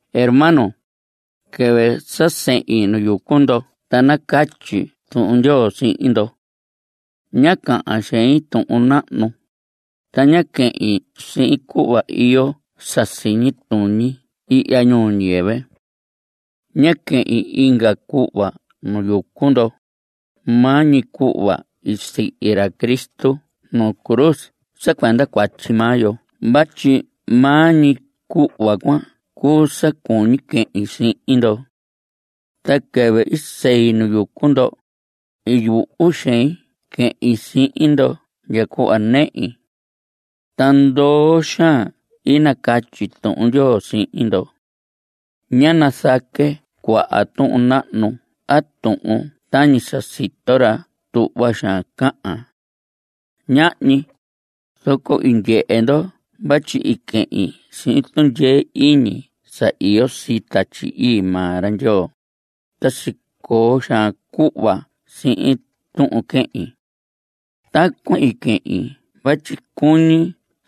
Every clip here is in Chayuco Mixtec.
Hermanos, quɨvɨ sa sehin nu yucu ndo ta nacatyi Tuhun Ndyoo sihin ndo. Ñá cahan xein tuhun nahnu, ta ñá quehin sihin cuhva iyo sa siñi tuñi ihya ñuu ñiyɨvɨ. Ñá quehin inga cuhva nu yucu ndo, maa ñi cuhva i sihi ra Cristo nuu cruz sa cuenda cuatyi maa yo vatyi maa ñi cuhva cuan cuu sa cuñi quehin sihin ndo. Ta quɨvɨ i sei nu yucu ndo, i yuhu xein quehin sihin ndo ndya cuhva nehi. Ta ndoo xaan i nacatyi Tuhun Ndyoo sihin ndo. Ñá nazaque cuaha tuhun nahnu a tuhun tañi sa sito ra tuhva xaan cahan. Ñahñi. Zoco i ndyehe ndo vatyi i quehin sihin tundyee iñi sa iyo sii Tatyi Ii maa ra Ndyoo, ta sicoo xaan cuhva sihin tuhun quehin. Tacuan i quehin vatyi cuñi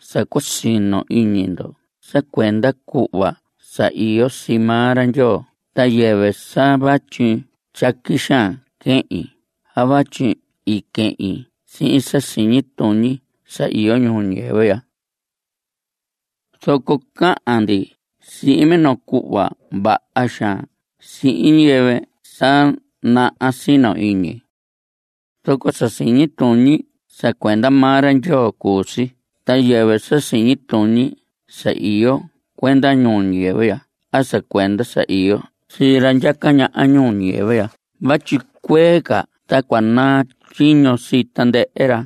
sa cua sino iñi ndo sa cuenda cuhva sa iyo sii maa ra Ndyoo ta yɨvɨ sa vatyi tyaqui xaan quehin a vatyi i quehin sihin sa siñi tuñi sa iyo ñuu ñiyɨvɨ ya. Zoco cahan ndi sihin minoo cuhva vaha xaan sihin ñiyɨvɨ sa naha sino iñi. Zoco sa siñi tuñi sa cuenda maa ra Ndyoo cuu si ta yɨvɨ sa siñi tuñi sa iyo cuenda ñuu ñiyɨvɨ ya a sa cuenda sa iyo sii ra ndyaca ñaha ñuu ñiyɨvɨ ya vatyi cuee ca ta cua naa tyiño sii tandɨhɨ ra.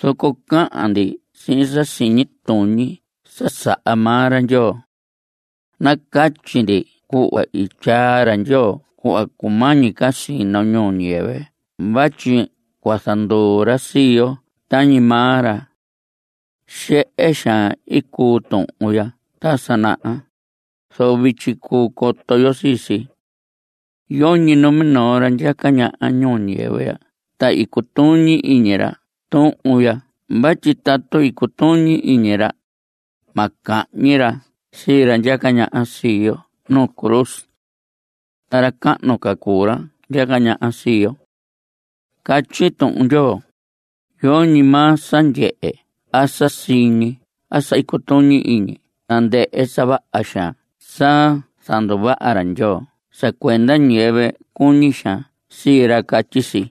Zoco cahan ndi sihin sa siñi tuñi sa saha maa ra Ndyoo. Nacatyi ndi cuhva i tyaa ra Ndyoo cuhva cumañi ca sino ñuu ñiyɨvɨ vatyi cua zanduu ra sii yo tañi maa ra. Xehe xaan i cuu tuhun ya ta sa naha, zoco vityi cuu coto yo sii si. Yoñi numinoo ra ndyaca ñaha ñuu ñiyɨvɨ ya ta i cutuñi iñi ra tuhun ya vatyi tatu cutuñi iñi ra, ma cahñi ra sii ra ndyaca ñaha sii yo nuu cruz. Ta ra cahnu ca cuu ra ndyaca ñaha sii yo. Catyi Tuhun Ndyoo: Yoñi maa sa ndyehe a sa siñi a sa cutuñi iñi tandɨhɨ sa vaha xaan sa zanduvaha ra Ndyoo sa cuenda ñiyɨvɨ cuñi xaan sii ra. Catyi si.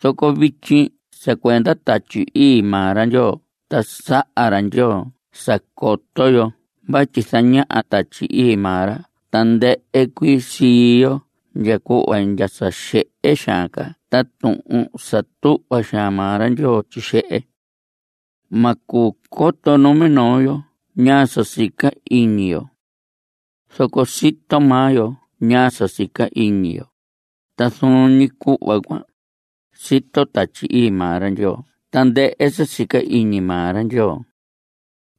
Zoco vityi sa cuenda Tatyi Ii maa ra Ndyoo ta saha ra Ndyoo sa coto yo vatyi zañaha Tatyi Ii maa ra tandɨhɨ cuii sii yo ndya cuhva ndya sa xehe xaan ca ta tuhun sa tuhva xaan maa ra Ndyoo tyixehe. Ma cuu coto numinoo yo ñaa sa sica iñi inga yo. Zoco sito maa yo ñaa sa sica iñi yo. Ta zuun ñi cuhva cuan, sito Tatyi Ii maa ra Ndyoo tandɨhɨ sa sica iñi maa ra Ndyoo.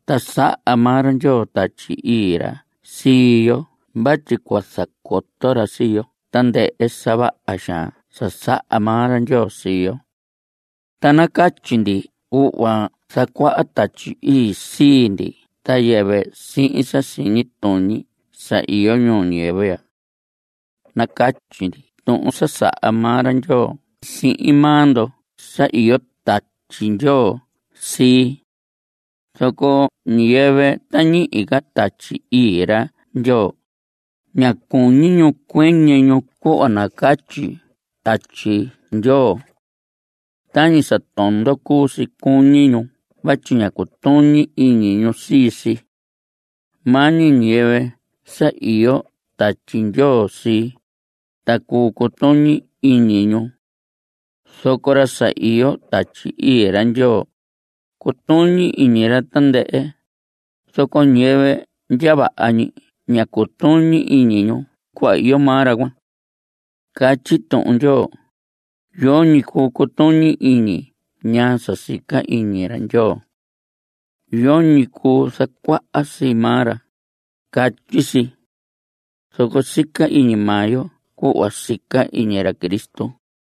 Ta saha maa ra Ndyoo Tatyi Ii ra sii yo vatyi cua zacoto ra sii yo tandɨhɨ sa vaha xaan sa saha maa ra Ndyoo sii yo. Ta nacatyi ndi cuhva zacuaha Tatyi Ii sii ndi ta yɨvɨ sihin sa siñi tuñi sa iyo ñuu ñiyɨvɨ ya. Nacatyi ndi tuhun sa saha maa ra Ndyoo sihin maa ndo sa iyo Tatyi Ndyoo sii. Zoco ñiyɨvɨ ta ñihi ca Tatyi Ii ra Ndyoo, ña cuñi ñu cuɨñɨ ñu cuhva nacatyi Tatyi Ndyoo. Tañi sa tondo cuu si cuñi ñu vatyi ña cutuñi iñi ñu sii si. Maa ñi ñiyɨvɨ sa iyo Tatyi Ndyoo sii, ta cuu cutuñi iñi ñu. Zoco ra sa iyo Tatyi Ii ra Ndyoo, cutuñi iñi ra tandɨhɨ. Zoco ñiyɨvɨ ndya vaha ñi ña cutuñi iñi ñu cuhva iyo maa ra cuan. Catyi Tuhun Ndyoo: “Yoñi cuu cutuñi iñi ñaa sa sica iñi ra Ndyoo. Yoñi cuu zacuaha sii maa ra”, catyi si. Zoco sica iñi maa yo cuhva sica iñi ra Cristo.